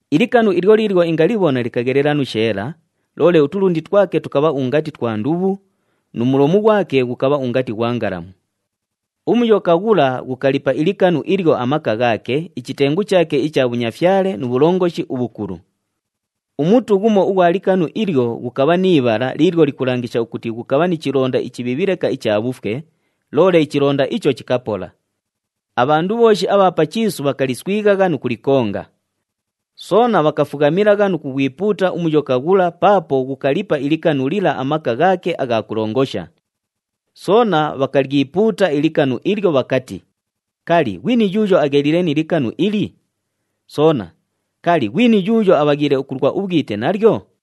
Ilikanu ilyo liilyo ingalibhona likaghelela nu sheela, loole utulundi twake tukabha ungati twa ndubhu, nu mulomu ghwake ghukabha ungati ghwa ngalamu. UMuyoka ghula ghukalipa ilikanu ilyo amaka ghaake, ichitengu chaake icha bhunyafyale nu bhulongoshi ubhukulu. Umutu ghumo ughwa likanu ilyo ghukabha ni ibhala liilyo likulangisha ukuti ghukabha ni chilonda ichibhiibhi leka icha bhufwe, loole ichilonda icho chikapola. Abhandu bhooshi abha pa chiisu bhakaliswighagha nu kulikonga. Soona bhakafughamilagha nu kughwipuuta uMuyoka ghula paapo ghukalipa ilikanu lila amaka ghaake agha kulongosha. Soona bhakalyipuuta ilikanu ilyo bhakati, “Kali, ghwini yuuyo agheliile ni likanu ili? Soona, kali, ghwini yuuyo abhaghiile ukulwa ubhwite nalyo?”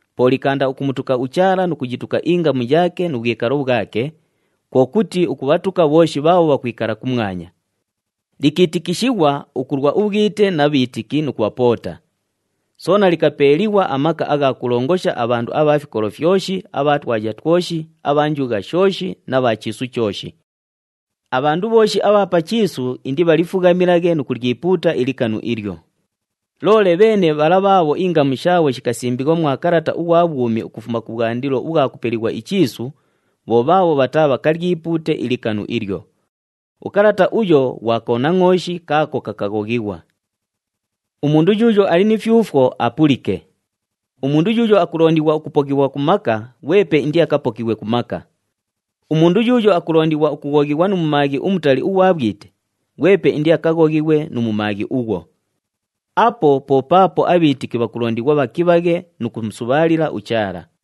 Po likaanda ukumutuka uChaala nu kuyituka ingamu yaake nu bhwikalo bhwake, kwo kuti ukubhatuka bhooshi bhaabho bhakwikala kumwanya. Likiitikishighwa ukulwa ubhwite na bhiitiki nu kubhapoota. Soona likapeeliighwa amaka agha kulongosha abhandu abha fikolo fyoshi, abha twaya twoshi, abha njugha shooshi na bha chiisu chooshi. Abhandu bhooshi abha pa chiisu indibhalifughamilaghe nu kulyipuuta ilikanu ilyo. Loole bheene bhala bhaabho ingamu shaabho shikasimbighwa mwa kalata ughwa bhwumi ukufuma kubhwandilo ubhwa kupelighwa ichiisu, bho bhaabho bhataabhakalyipuute ilikanu ilyo. Ukalata uyo ghwa Konangʼooshi kaako kakaghoghighwa. Umundu yuuyo ali ni fyufwo, apulike. Umundu yuuyo akulondighwa ukupokighwa ku maka, ghwepe indiakapokighwe ku maka. Umundu yuuyo akulondighwa ukughoghighwa nu mumaaghi umutali ughwa bhwite, ghwepe indiakaghoghighwe nu mumaaghi ughwo. Apo po paapo abhiitiki bhakulondighwa bhakibhaghe nu kumusubhaalila uChaala.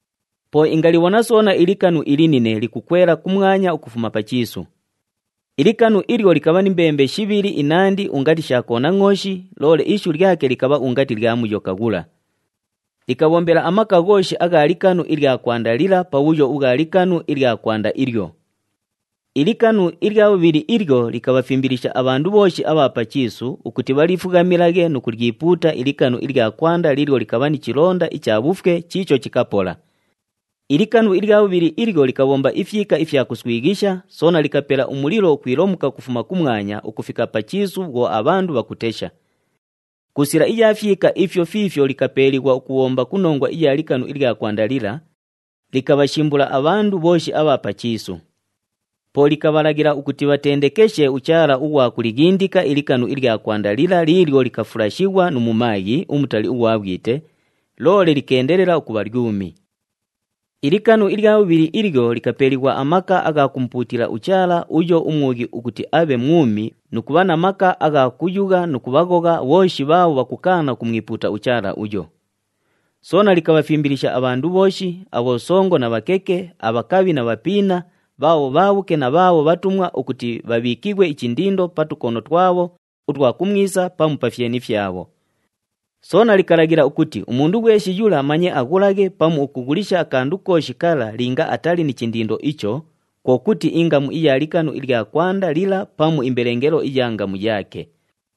Po ingalibhona soona ilikanu ilinine likukwela kumwanya ukufuma pa chiisu. Ilikanu ilyo likabha ni mbembe shibhili inandi ungati sha konangʼooshi, loole ishu lyake likabha ungati lya Muyoka ghula. Likabhombela amaka ghooshi agha likanu ilya kwanda lila pa bhuyo ubhwa likanu ilya kwanda ilyo. Ilikanu ilya bhubhili ilyo likabhafimbilisha abhandu bhooshi abha pa chiisu ukuti bhalifughamilaghe nu kulyipuuta ilikanu ilya kwanda liilyo likabha ni chilonda icha bhufwe chiicho chikapola. Ilikanu ilya bhubhili ilyo likabhomba ifyika ifya kuswighisha, soona likapela umulilo ukwilomuka ukufuma kumwanya ukufika pa chiisu bhwo abhandu bhakutesha. Ku sila iya fyika ifyo fiifyo likapeeliighwa ukubhomba ku nongwa iya likanu ilya kwanda lila, likabhashimbula abhandu bhooshi abha pa chiisu. Po likabhalaghila ukuti bhatendekeshe uchaala ughwa kulighindika ilikanu ilya kwanda lila liilyo likafulashighwa nu mumaaghi umutali ughwa bhwite, loole likeendelela ukubha lyumi. Ilikanu ilya bhubhili ilyo likapeeliighwa amaka agha kumupuutila uchaala uyo umwughi ukuti abhe mwumi nu kubha na maka agha kuyugha nu kubhaghogha bhooshi bhaabho bhakukaana ukumwipuuta uchaala uyo. Soona likabhafimbilisha abhandu bhooshi, abhosongo na bhakeke, abhakabhi na bhapiina, bhaabho bhaabhuke na bhaabho bhatumwa ukuti bhabhiikighwe ichindindo pa tukono twabho utwa kumwisa pamu pa fyeni fyabho. Soona likalaghila ukuti umundu ghweshi yula manye aghulaghe pamu ukughulisha akandu kooshi kala linga atali ni chindindo icho, kwo kuti ingamu iya likanu ilya kwanda lila pamu imbelengelo iya ngamu yaake.